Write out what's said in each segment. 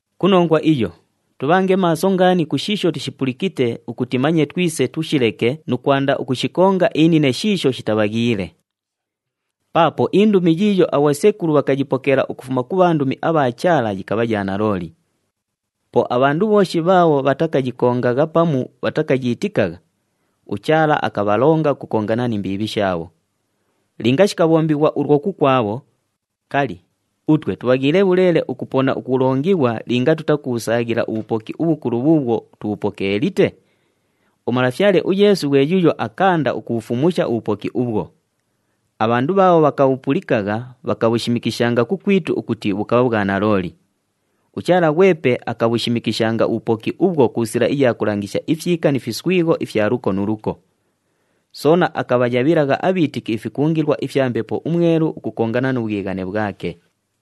Ku nongwa iyo, tubhange maaso ngaani ku shiisho tushipulikite ukuti manye twise tushileke nu kwanda ukushikonga inine shiisho shitabhaghiile. Paapo indumi yiiyo abhosekulu bhakayipokeela ukufuma ku bhandumi abha Chaala yikabha ya nalooli. Po abhandu bhooshi bhaabho bhatakayikongagha pamu bhatakayiitikagha, uChaala akabhalonga ukukongana ni mbiibhi shaabho. Linga shikabhombighwa ulwo kukwabho, kali, utwe tubhaghiile bhuleele ukupona ukulongighwa linga tutakubhusaaghila ubhupoki ubhukulu bhuubhwo tubhupokeelite? UMalafyale uYeesu ghwe yuuyo akaanda ukubhufumusha ubhupoki ubhwo. Abhandu bhaabho bhakamupulikagha, bhakashimikisha kukwitu ukuti bhukabha bhwa nalooli. UChaala ghwepe akabhushimikishanga ubhupoki ubhwo ku sila iya kulangisha ifyika ni fiswigho ifya luko nu luko. Soona akabhayabhilagha abhiitiki ifikungilwa ifya Mbepo uMwelu ukukongana nu bhwighane bhwake.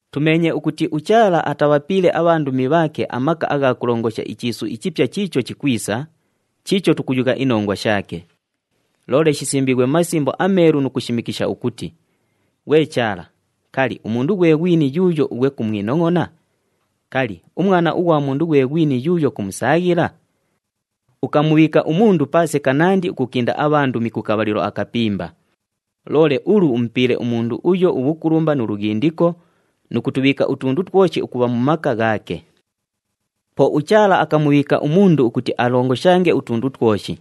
Tumeenye ukuti uChaala atabhapiile abhandumi bhaake amaka agha kulongosha ichiisu ichipya chiicho chikwisa, chiicho tukuyugha inongwa shaake. Loole shisimbiighwe mu Masimbo aMeelu nu kushimikisha ukuti, “Ghwe Chaala, kali, umundu ghwe ghwini yuuyo ughwe kumwinongʼona? Kali, umwana ughwa mundu ghwe ghwini yuuyo kumusaaghila? Ukamubhiika umundu paase kanandi ukukinda abhandumi ku kabhalilo akapimba. Loole ulu umupiile umundu uyo ubhukulumba nu lughindiko, nu kutubhiika utundu twoshi ukubha mu maka ghaake.” Po uChaala akamubhiika umundu ukuti alongoshange utundu twoshi.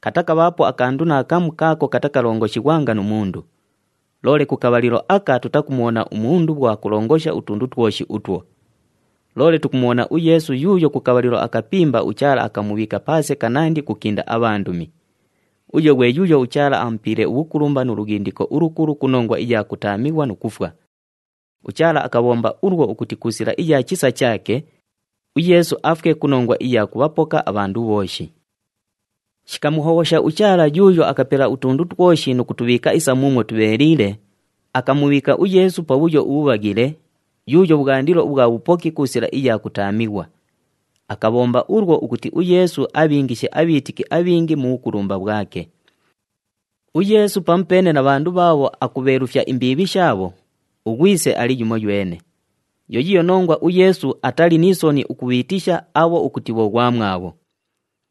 Katakabhaapo akandu naakamu kaako katakalongoshighwanga nu mundu. Loole ku kabhalilo aka tutakumubhona umundu bhwo akulongosha utundu twoshi utwo. Loole tukumubhona uYeesu yuuyo ku kabhalilo akapimba uChaala akamubhiika paase kanandi ukukinda abhandumi. Uyo ghwe yuuyo uChaala amupiile ubhukulumba nu lughindiko ulukulu ku nongwa iya kutaamighwa nu kufwa. UChaala akabhomba ulwo ukuti ku sila iya chisa chaake, uYeesu afwe ku nongwa iya kubhapoka abhandu bhooshi. Shikamuhobhosha uChaala yuuyo akapela utundu twoshi nu kutubhiika isa muumwo tubheeliile, akamubhiika uYeesu pabhuyo ubhubhaghile, yuuyo bhwandilo ubhwa bhupoki ku sila iya kutaamighwa. Akabhomba ulwo ukuti uYeesu abhiingishe abhiitiki abhingi mu bhukulumba bhwake. UYeesu pamupeene na bhandu bhaabho akubheelufya imbiibhi shaabho, uGhwise ali yumoywene. Yo yiiyo nongwa uYeesu atali ni soni ukubhiitisha abho ukuti bhoghwamwabho.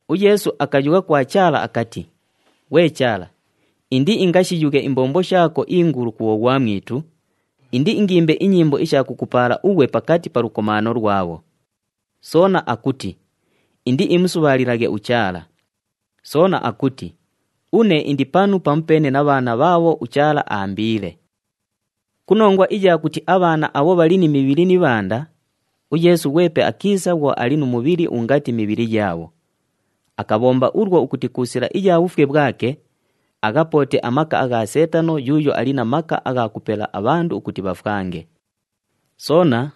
UYeesu akayugha kwa Chaala akati, “Ghwe Chaala, indiingashiyughe imbombo shaako ingulu ku bhoghwamwitu, indiingimbe inyimbo isha kukupaala ughwe pakati pa lukomaano lwabho.” Soona akuti, “Indiimusubhaalilaghe uChaala.” Soona akuti, “Une indi panu pamupeene na bhaana bhaabho uChaala aambiile.” Ku nongwa iya kuti abhaana abho bhali ni mibhili ni ibhanda, uYeesu ghwepe akiisa bhwo ali nu mubhili ungati mibhili yaabho. Akabhomba ulwo ukuti ku sila iya bhufwe bhwake, aghapoote amaka agha Seetano yuuyo ali na maka agha kupela abhandu ukuti bhafwange. Soona,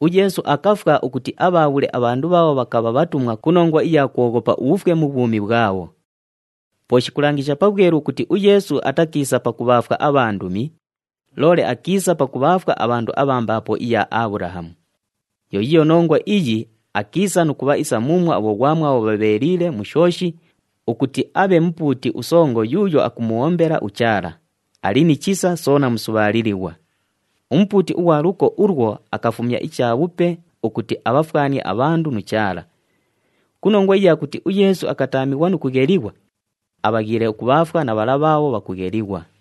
uYeesu akafwa ukuti abhaabhule abhandu bhaabho bhakabha bhatumwa ku nongwa iya kwoghopa ubhufwe mu bhwumi bhwabho. Po shikulangisha pabhwelu ukuti uYeesu atakiisa pakubhaafwa abhandumi, loole akiisa pakubhaafwa abhandu abha mbaapo iya Abhulahamu. Yo yiiyo nongwa iyi, akiisa nu kubha isa muumwo abhoghwamwabho bhabheeliile mu shooshi ukuti abhe Mupuuti uSongo yuuyo akumubhombela uChaala, ali ni chisa soona musubhaalilighwa. UMupuuti ughwa luko ulwo akafumya ichabhupe ukuti abhafwanie abhandu nu Chaala. Ku nongwa iya kuti uYeesu akataamighwa nu kughelighwa, abhaghiile ukubhaafwa na bhala bhaabho bhakughelighwa.